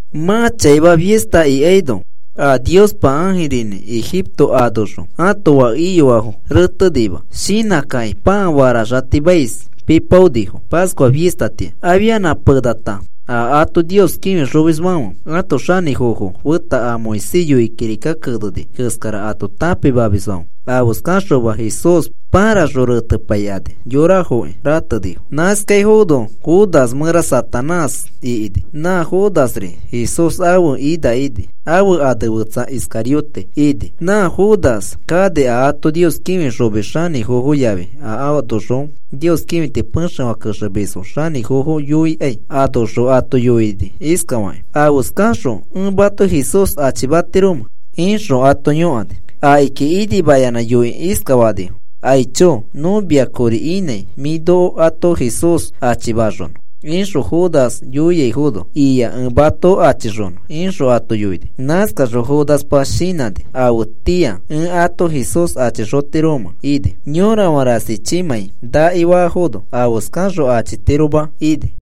Mã chaima fista ikaino a Niospa ãjirinĩ Egipto anoxõ ãto fake iyoafo retenima shinãkakĩ pãa faraxatimais pipaonifo, Pascua fistatĩa. Afia penata a ato Nios kĩfixomisfãfe ãto xanĩfofo feta a Moisés yoikĩ kirika keneni keskara ato tãpimamisfãfe afeskaxoma Jesús pãraxõ retepaikani yorafoki ratenifo. Nãskaifono Judas mẽra Satanás ikini. Nã Judasri Jesús ãfe ina ini. Ãfe ane fetsa Iscariote ini. Nã Judas kani a ato Nios kĩfixomis xanĩfofo yafi a anoxõ Nios kĩfiti pexefã kexemisfo xanĩfofo yoikai. Anoxõ ato yoini iskafakĩ: “¿Afeskaxõ ẽ mato Jesús achimatiromẽ?” ixõ ato yõkani. Akiki inimayanã yoikĩ iskafanifo: “Aicho, nõ mia kori inãi mĩ noko ato Jesús achimaxonõ,” ixõ Judas yoiaifono, “Ia. Ẽ mato achixonõ,” ixõ ato yoini. Nãskaxõ Judaspa shinãni afetĩa ẽ ato Jesús achixotiromẽ ini. Yorafã rasichimãi naki faafono afeskaxõ achitiroma ini.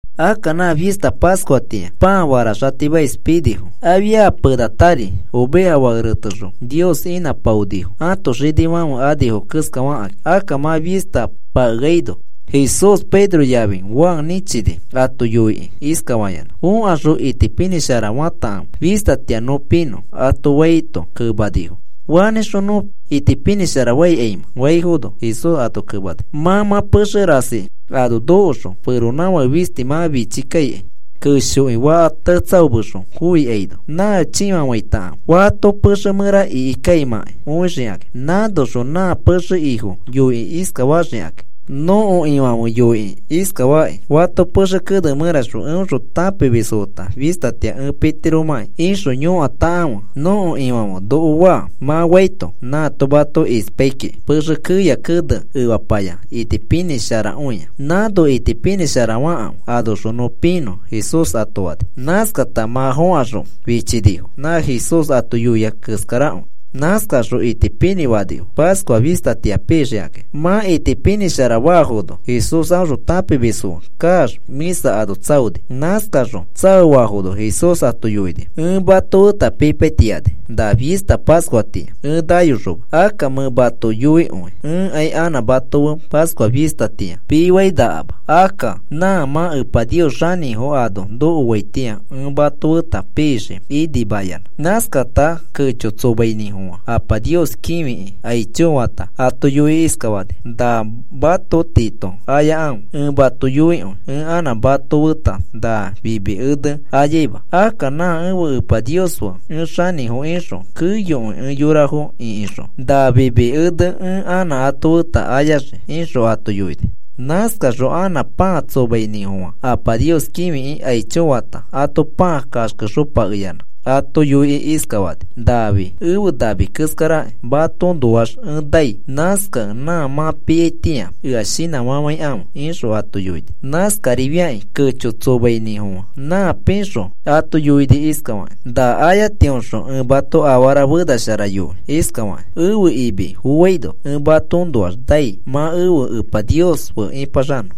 Akka nã fista Pascuatĩa pãa faraxatimais pinifo. Afia penatari oveja fake retexõ Nios inãpaonifo ãto xinifãfe anifo keskafakĩ. Akka mã fista pakeano, Jesús Pedro yafi Juan nĩchini ato yoikĩ iskafayanã: “Fokaxõ itipinĩsharafatakãfe fistatĩa nõ pinõ,” ato faito, kemanifo: “¿Fanĩxõ nõ itipinĩsharafaikaimẽ?” faifono, Jesús ato kemani: “Mã mã pexefã rasi ano nokoxõ feronãfake fisti mã fichi kaikai keshoki faka tetsaomexõ foikaino. Nã chĩfafaitakãfe fato pexe mẽra ikikaimãkai õixikakĩ. Nãnoxõ nã pexe ifo yoikĩ iskafaxikakĩ: ‘Nõko Ifãfe noko yoikĩ iskafakĩ: “Fato pexe kene mẽraxõ eõxõ tãpimisfo feta fistatĩa ẽ pitiromãki ixõ yõkatakãfe nõko Ifãfe noko faa,” mã faito, nãato mato ispai kiki pexe keya kene efapaya itipinĩsharakõia. Nãno itipinĩsharafakãfe anoxõ nõ pinõ,’” Jesús ato fani. Nãskata mã fokaxõ fichinifo nã Jesús ato yoia keskarakõi. Nãskaxõ itipinĩ fanifo Pascua fistatĩa pixikakĩ. Mã itipinĩshara faafono, Jesús a aõxõ tãpimisfo fe kaax, mĩsa ano tsaoni. Nãskaxõ tsaoafono Jesús ato yoini: “Ẽ mato feta pipaitiani na fista Pascuatĩa ẽ nayoxoma. Akka ẽ mato yoikõi ẽkai anã mato feta Pascua fistatĩa pifainakama. Akka nã mã Epa Nios xanĩfo ano nokoaitĩa ẽ mato feta pixii inimayanã.” Nãskata kecho tsomainĩfofã Apa Nios kĩfikĩ, “Aicho,” fata, ato yoikĩ iskafani: “Na mato tiito ayakãfe. Ẽ mato yoikõi ẽ anã mato feta na fimi ene ayaima. Akka nã ẽfe Epa Nios fe ẽ xanĩfo ixõ keyokõi ẽ yorafo ĩkixõ na fimi exe ẽ anã ato feta ayaxii,” ixõ ato yoini. Nãskaxõ anã pãa tsomainĩfofã, Apa Nios kĩfikĩ aicho fata, ato pãa kaxkexopakeyanã ato yoikĩ iskafani: “Nafi efe nami keskaraki. Matoõnoax ẽ nai. Nãskakẽ nã mã piaitĩa ea shinãfafãikãfe,” ixõ ato yoini. Nãskarifiakĩ kecho tsomainĩfofã nã pixõ ato yoini iskafakĩ: “Na ayatiõxõ ẽ mato afara fenashara yoi iskafakĩ: Ẽfe imi foaino ẽ matoõnoax nai mã ẽfe Epa Nios fe ĩpaxanõ.”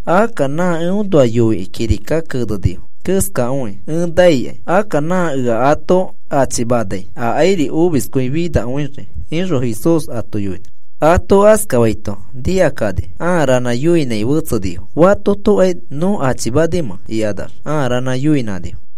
Akka nã eõnoa yoikĩ kirika kenenifo keskakõi ẽ naikai. Akka nã ea ato achimanai akairi omiskõi finakõi,” ixõ Jesús ato yoini. Ato askafaito nikakani ãa ranã yoinãi fetsenifo: “¿Fatotokai nõ achimanimẽ?” ikanax ãa ranã yoinãnifo.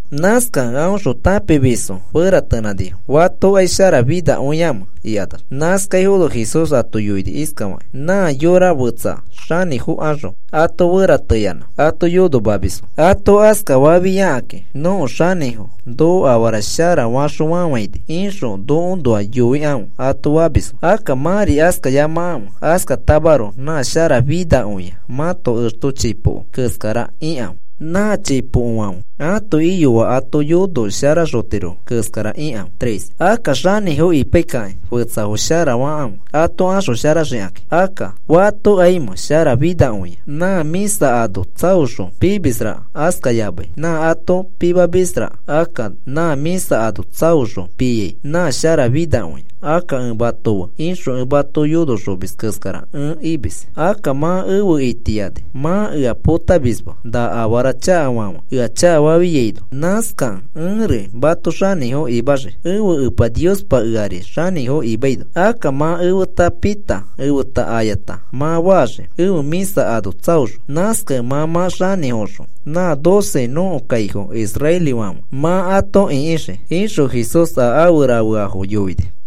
Nãskakẽ aõxõ tãpimisfo feratenãnifo fatokai sharafinakõiamẽ ikanax. Nãskaifono Jesús ato yoini iskafakĩ: “Nã yora fetsafo xanĩfokaxõ ato ferateyanã ato yonomamisfo. Ato askafafiakakĩ nõko xanĩfo noko afara shara faxõ fafãini ixõ nokoõnoa yoikãfe, ato famisfo. “Akka mãri askayamakãfe. Askatamaroko nã sharafinakõia mãto exto chipoko keskara ikãfe. Nã chipokofãfe ãto iyoafo ato yonoxosharatirofo keskara ikãfe. Akka xanĩfo ipaikakĩ fetsafo sharafakãfe ato axosharaxikakĩ. Akka, ¿fatokaimẽ sharafinakõia, nã mĩsa ano tsaoxõ pimisraka, askayamai nã ato pimamisraka? Akka nã mĩsa ano tsaoxõ piai nã sharafinakõia. Akka ẽ mato fe ixõ ẽ mato yonoxomis keskara ẽ imis. “Akka mã efe itiani mã ea potamisma, na afara chakafãfe ea chakafafiaino. Nãskakẽ ẽri mato xanĩfo imaxii, ẽfe Epa Niospa eari xanĩfo imaino. Akka mã efeta pita efeta ayata mã faxii ẽfe mĩsa ano tsaoxõ. Nãskakẽ mã mã xanĩfoxõ nã doce nõko kaifo israelifãfe mã ato ĩkixii,” ixõ Jesús a afe rafeafo yoini.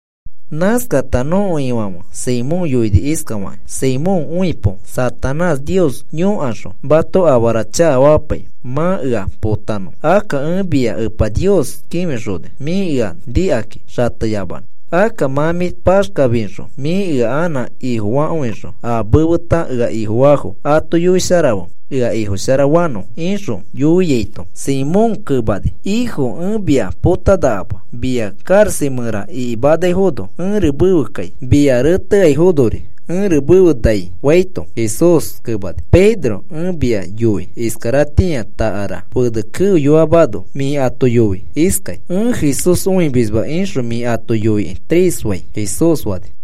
Nãskata nõko Ifãfe Simón yoini iskafakĩ: “Simón, õipo Satanás Nios yõkaxõ mato afara chakafamapai, mã ea potanõ. Akka ẽ mia Epa Nios kĩfixoni mĩ ea nikakĩ xateyamanõ. Akka mã mĩ paxkafixõ mĩ ea anã Ifofakõixõ a mefeta ea Ifofaafo ato yoisharafe ea Ifosharafanõfo,” ixõ yoiaito, Simón kemani: “Ĩfo, ẽ mia potanakama. Mia karaxa mẽra ikimanaifono ẽri mefe kai. Mia reteaifonori ẽri mefe nai,” faito, Jesús kemani: “Pedro, ẽ mia yoi iskaratĩa takara fene keoyoamano mĩ ato yoi iskai: ‘Ẽ Jesús õimisma,’ ixõ mĩ ato yoikĩ tres fai,” Jesús fani.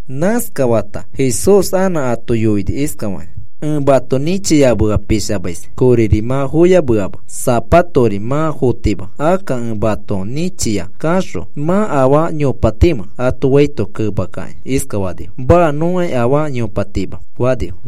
Nãskafata Jesús anã ato yoini iskafakĩ: “Ẽ mato nĩchiyamea pishamais koriri mã foyameama, sapatori mã fotima. Akka ẽ mato nĩchia kaxõ ¿mã afaa yopatimẽ?” ato faito kemakakĩ iskafanifo: “Maa. Nõkai afaa yopatima,” fanifo.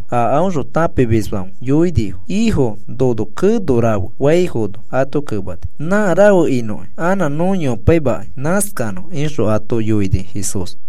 a aõxõ tãpimisfãfe yoinifo: “Ifo, nono keno rafe,” faifono, ato kemani: “Nã rafe inõkĩ anã nõ yopaimakai. Nãskanõ,” ixõ ato yoini Jesús.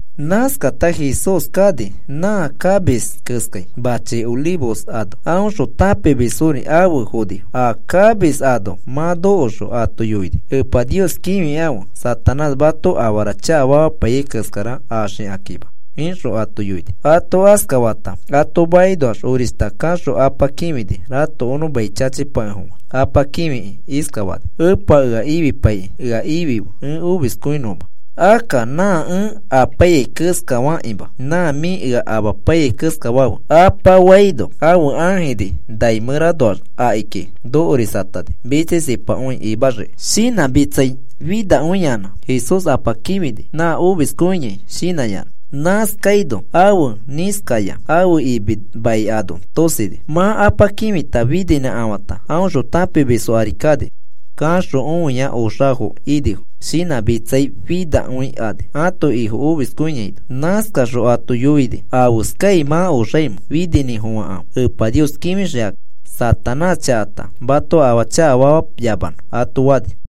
Nãskata Jesús kani nã kamis keskai machi Olivos ano. Aõxõ tãpimisfori afe fonifo. A kamis ano mã nokoxõ ato yoini: “Epa Nios kĩfikãfe Satanás mato afara chakafamapaiyai keskara axikakĩma,” ixõ ato yoini. Ato askafata ato makinoax orishta kaxõ Apa kĩfini ratokonõ mai chachipakefofã. Apa kĩfikĩ iskafani: “Epa, ea ifipaikĩ ea ifife ẽ omiskõinõma. Akka nã ẽ apaiyai keskafakĩma, nã mĩ ea amapaiyai keskafafe,” Apa faino, ãfe ãjiri nai mẽranoax akiki nokorisatani mitsisipakõi imaxiki. Shinãmitsai finakõiyanã, Jesús Apa kĩfini nã omiskõiai shinãyanã. Nãskaino ãfe nĩskaya ãfe imi mai ano tosini. Mã Apa kĩfita fininãkafãta, aõxõ tãpimisfo ari kani. Kaxõ õia oxafo inifo shinãmitsai finakõikani ãto Ifo omiskõiaino. Nãskaxõ ato yoini: “¿Afeskai mã oxaimẽ? Fininĩfofãkãfe Epa kĩfixikakĩ Satanás chakata mato afaa chakafamayamanõ,” ato fani.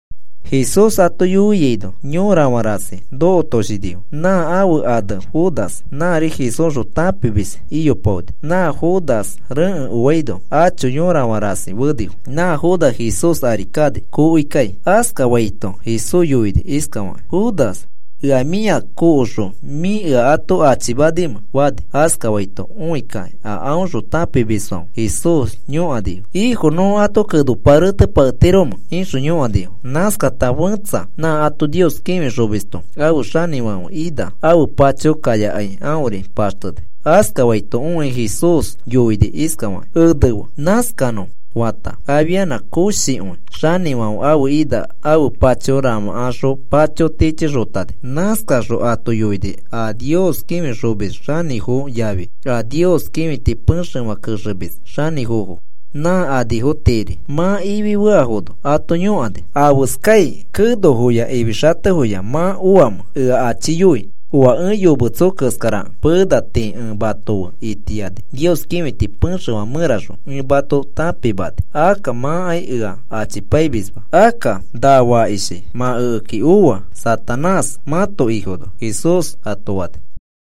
Jesús ato yoiaino yorafã rasi nokotoshinifo. Nã ãfe ane Judas, nãri Jesúsxõ tãpimis iyopaoni, nã Judas rekẽ oaino acho yorafã rasi fenifo. Nã Judas Jesús ari kani kokoikai. Askafaito Jesús yoini iskafakĩ: “¿Judas, ea mĩa kokoxõ mĩ ea ato achimanimẽ?” fani. Askafaito õikakĩ a aõxõ tãpimisfãfe Jesús yõkanifo: “¿Ĩfo, nõ ato kenopa rerapaketiromẽ?” ixõ yõkanifo. Nãskata fẽtsa nã ato Nios kĩfixomisto ãfe xanĩfãfe ina ãfe pacho kayakai aõri paxteni. Askafaito õikĩ Jesús yoini iskafakĩ: “Enefe. Nãskanõ,” fata afianã koshikõi xanĩfãfe ãfe ina ãfe pacho ramãkaxõ pacho tichixotani. Nãskaxõ ato yoini a Nios kĩfixomis xanĩfofo yafi a Nios kĩfiti pexefã kexemis xanĩfofo, nã anifo tiiri mã ifi feafono ato yõkani: “¿Afeskai kenofoya ifixatefoya mã oamẽ ea achiyoi oa ẽ yometso keskarakẽ? Pena tii ẽ mato fe itiani Nios kĩfiti pexefã mẽraxõ ẽ mato tãpimani, akka mãkai ea achipaimisma. Akka na fakishi mã ekeki oa Satanás mãto ifono,” Jesús ato fani.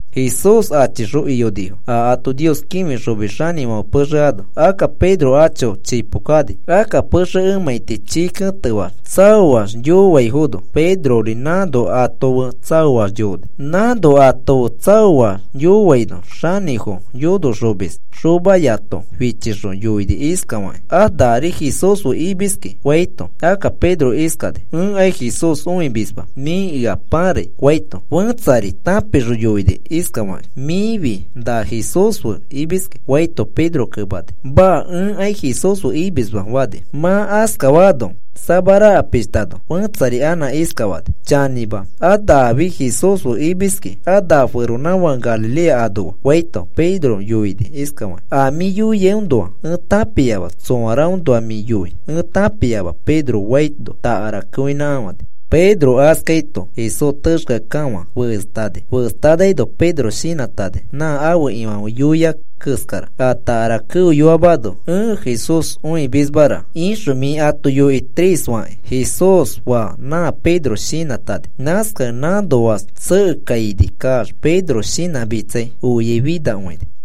Jesús achixõ iyonifo a ato Nios kĩfixomis xanĩfãfe pexe ano. Akka Pedro acho chipo kani. Akka pexe emãiti chii ketefaax tsaoax yoaifono Pedrori nãno ato fe tsaoax yooni. Nãno ato fe tsaoax yooaino xanĩfo yonoxomis xomayato fichixõ yoini iskafakĩ: “A nari Jesús fe imiski,” faito, Akka Pedro iskani: “Ẽkai Jesús õimisma. Mĩ ea pãrai,” faito, fẽtsari tãpixõ yoini iskafakĩ: “Mĩfi na Jesús fe imiski,” faito, Pedro kemani: “Maa. Ẽkai Jesús fe imisma,” fani. Mã askafaafo samaraka pishtano, fetsari anã iskafani: “Chanĩma, a nafi Jesús fe imiski. A na feronãfake Galilea anoa,” faito, Pedro yoini iskafakĩ: “A mĩ yoiaiõnoa ẽ tãpiama tsoaraõnoa mĩ yoi ẽ tãpiama,” Pedro faino takara keoinãkafãni. Pedro askaito Jesús texkeakekafã festani. Festanaino Pedro shinãtani nã ãfe Ifãfe yoia keskara. “A takara keoyoamano, ‘Ẽ Jesús õimismara,’ ixõ mĩ ato yoi tres fakĩ,” Jesús faa nã Pedro shinãtani. Nãskakẽ nãnoax tsekekaini kaax Pedro shinãmitsai oiai finakõini.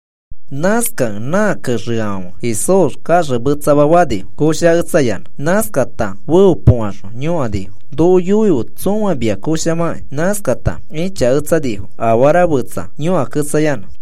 Nãskakẽ nã kexeafãfe Jesús kaxemetsama fanifo koshaketsayanã. Nãskata feopokaxõ yõkanifo: “Noko yoife tsõa mia koshamakĩ.” Nãskakata ĩchaketsanifo afara fetsa yõkaketsayanã.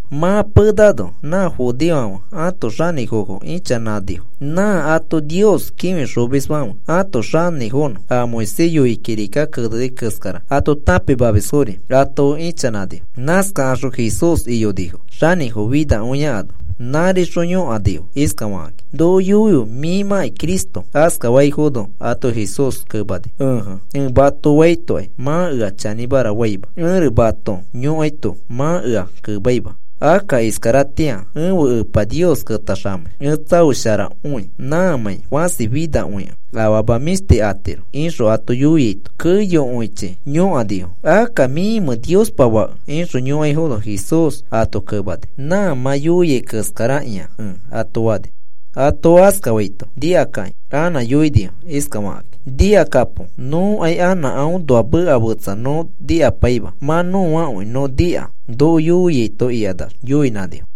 Mã penano a judeofãfe ãto xanĩfofo ichanãnifo. Nã ato Nios kĩfixomisfãfe ãto xanĩfofonõ, a Moisés yoikĩ kirika keneni keskara ato tãpimamisfori ato fe ichanãnifo. Nãskakaxõ Jesús iyonifo xanĩfo finakõia ano. Nãrixõ yõkanifo iskafakakĩ: “Noko yoife mĩmãkĩ Cristo.” Askafaifono ato Jesús kemani: “Ẽje, ẽ mato faitokai mã ea chanĩmara faima. Ẽri mato yõkaito mã ea kemaima. Akka iskaratĩa ẽfe Epa Nios ketaxamei ẽ tsaosharakõi. Nãmãi fasi finakõikẽ afama mĩshti atiro,” ixõ ato yoiaito, keyokõichi yõkanifo: “Akka, ¿mĩmẽ Niospa Fake?” ixõ yõkaifono Jesús ato kemani: “Nã mã yoiai keskarakĩa ẽ,” ato fani. Ato askafaito nikakakĩ anã yoinifo iskafakãkĩ: “¡Nikakapo! Nõkai anã aõnoa meka fetsa nõ nikapaima. Mã nõakõi nõ nika noko yoiaito,” ikanax yoinãnifo.